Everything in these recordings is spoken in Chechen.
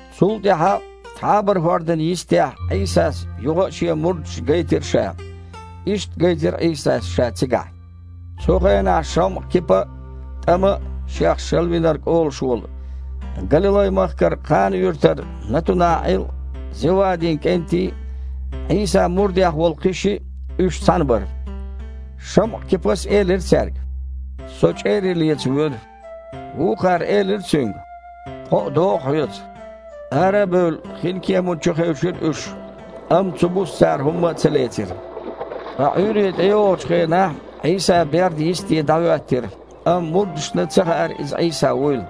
Цул тІаьхьа Тхьабара-хІордан йистехь Іийсас юха а Шен мурдашна гайтира Ша. Иштта гайтира Іийсас Ша цигахь. Цу хенахь ШамІа-Кипа а, ТІама а, шех Шалавинарг олуш волу, Галилай-махкара Кхана-юьртара НатунаІил а, Зевадин кІентий а, Іийсан мурдех волу кхин шиъ а – уьш цхьаьна бара. ШамІа-Кипас элира цаьрга: «Со чІерий леца воьду». Вукхара элира цуьнга: «Тхо а догІу хьоьца». Ара а бевлла, хинкеман чу хевшира уьш, амма цу буса цара хІумма а ца лецира. Ткъа Іуьйре тІейогІучу хенахь Іийса бердан йисте дІахІоьттира, амма мурдашна ца хаьара, Иза Іийса вуйла.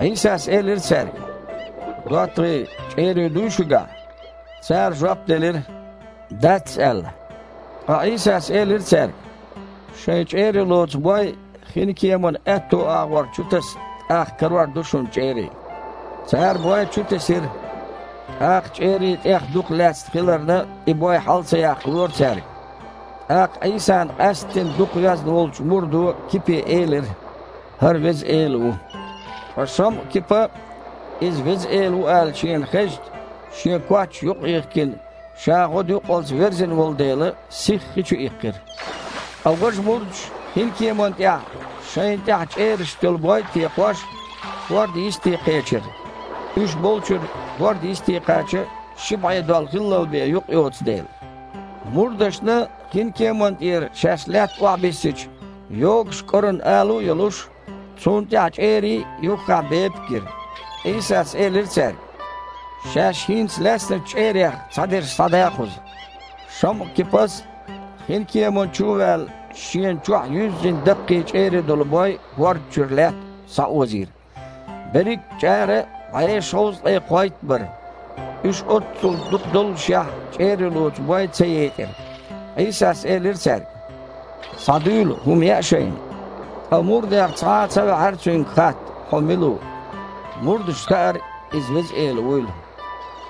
Іийсас элира цаьрга: «ДоттагІий, чІерий дуй шуьгахь?» Цара жоп делира: «Дац», – аьлла. Ткъа Іийсас элира цаьрга: «Шайн чІерий лоцу бой хинкеманан аьтту агІор чутаса, тІаккха карор ду шуна чІерий». Цара бой чутесира, тІаккха чІерий тІех дукха лаьцна хиларна, и бой хьала ца яккхалора цаьрга. ТІаккха Іийсана къаьсттина дукха везна волчу мурдо Кипе элира: «ХІара Веза Эла ву». Ткъа ШамІа-Кипа, иза Веза Эла ву аьлла шена хезча, шен коч юкъах а йихкина, ша гІодаюккъалц верзина волу дела, сихха хи чу иккхира. Ткъа важа мурдаш, хинкеманна тІехь, шайна тІаьхьа чІерашца йолу бой а текхош, хІордан йисте кхечира, уьш болчуьра хІордан йисте кхача, ши бІе дол хиллал бен юкъ йоцу дела. Мурдашна, хинкеманна тІера шаьш лаьтта охьабиссича, йогуш кІоран алу а йолуш, цунна тІехь чІерий а, юххехь бепиг а гира. Іийсас элира цаьрга: «Шаьш хІинца лаьцначу чІерех цхьадерш схьада кхуза». ШамІа-Кипас, хинкеман чу ваьлла, шена чохь юьззина даккхий чІерий долу бой хІорд чуьра лаьтта схьаозийра. Берриг а чІара бІе шовзткъе кхойтта бара. Уьш оццул дукха доллушехь, чІерий лоцу бой ца етІира. Іийсас элира цаьрга: «Схьадуьйла, хІума яа шайна». Ткъа мурдех цхьа а ца ваьхьара Цуьнга хатта: «Хьо мила ву?» Мурдашна хаьара, Иза Веза Эла вуйла.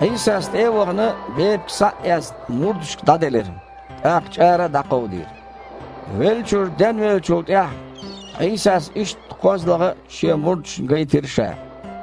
Іийсас, тІе а вахана, бепиг схьа а эцна, мурдашка дІаделира, тІаккха чІара а дІакховдийра. Веллачуьра денвеллачул тІаьхьа Іийсас иштта кхозлагІа а Шен мурдашна гайтира Ша.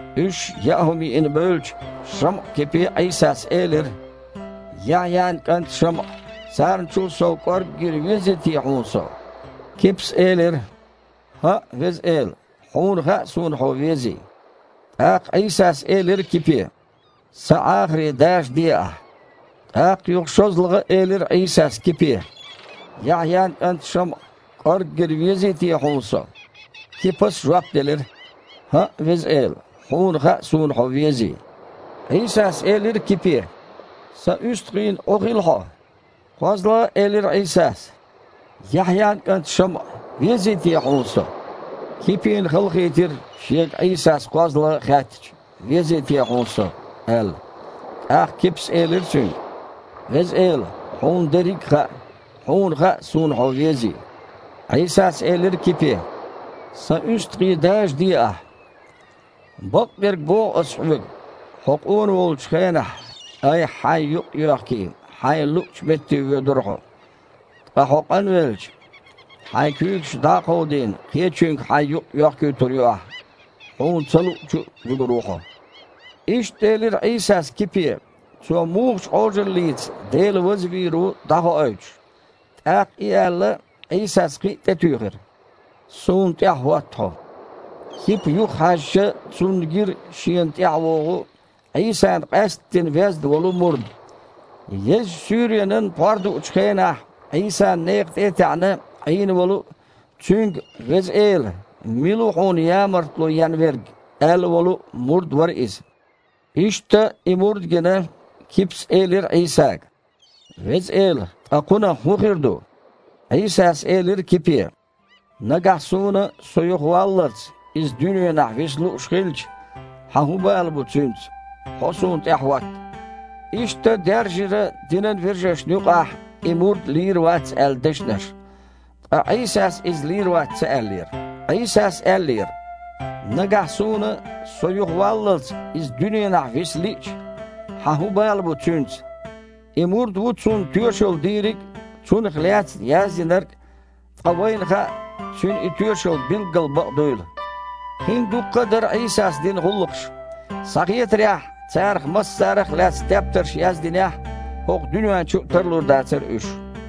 Уьш яа хІума йиина бевлча, ШамІа-Кипе Іийсас элира: «Яхьъян кІант ШамІа! Царначул сов кІорггера везий те хьуна Со?» Кипас элира: «ХІаъ, Веза Эла, Хьуна хаьа, суна Хьо везий». ТІаккха Іийсас элира Кипе: «Сан Іахарий дажаде ахьа». ТІаккха юха шозлагІа а элира Іийсас Кипе: «Яхьъян кІант ШамІа, кІорггера везий те хьуна Со?» Кипас жоп делира: «ХІаъ, Веза Эла, Хьуна хаьа, суна Хьо везий». Іийсас элира цуьнга: «Сан уьстагІийн Іу хила хьо». КхозлагІа а элира Іийсас: «Яхьъян кІант ШамІа, везий те хьуна Со?» Кипина халахийтира, шега Іийсас кхозлагІа а хаьттича: «Везий те хьуна Со?» – аьлла. ТІаккха Кипас элира Цуьнга: «Веза Эла, Хьуна дерриг хаьа. Хьуна хаьа, суна Хьо везий». Іийсас элира Кипе: «Сан уьстагІий дажаде ахьа. Бакъдерг боху Ас хьоьга, хьо къона волчу хенахь, айхьа-хьайн юкъ йоьхкий, хьайна луъучу метте воьдура хьо. Ткъа хьо къанвелча, хьайн куьйгаш дІа а кховдийна, кхечуьнга хьайн юкъ йоьхкуьйтур ю ахьа, хьуна ца луъучу а вуьгур ву хьо». Иштта элира Іийсас Кипе, цо мухачу Іожаллица Дела вазвийр ву дІахоуьйтуш. ТІаккха и аьлла, Іийсас кхин а тІетуьйхира: «Суна тІаьхьахІотта хьо». Кипа юхахьаьжча, цунна гира шена тІаьхьавогІу, Іийсана къаьсттина везна волу мурд. (Езачу суьйренан пхьор дуучу хенахь, Іийсан некха тІе а таьІна Іийна волу а, Цуьнга: «Веза Эла, мила ву Хьуна ямартло ен верг?» – аьлла волу а мурд вара иза.) Иштта, и мурд гина, Кипас элира Іийсага: «Веза Эла, ткъа кхунах хІун хир ду?» Іийсас элира Кипе: «Нагахь Суна, Со юхаваллалц, иза дуьненахь виса лууш хилча, хьан хІун бала бу цуьнца? Хьо Суна тІаьхьахІотта». Иштта даьржира динан вежаршна юкъахь и «мурд лийр вац» аьлла дешнаш. Ткъа Іийсас иза лийр вац ца аьллера. Іийсас аьллера: «Нагахь Суна, Со юхаваллалц, иза дуьненахь виса лиъча, хьан хІун бала бу цуьнца?» И мурд ву цунна тоьшалла дийриг а, цунах лаьцна яздинарг а, ткъа вайна хаьа, цуьнан и тоьшалла билггал бакъ дуйла. Кхин дуккха а дара Іийсас дина гІуллакхаш. Схьахетарехь, царах массарех лаьцна тептарш яздинехь, хІокху дуьнен чу а тарлур дацара уьш.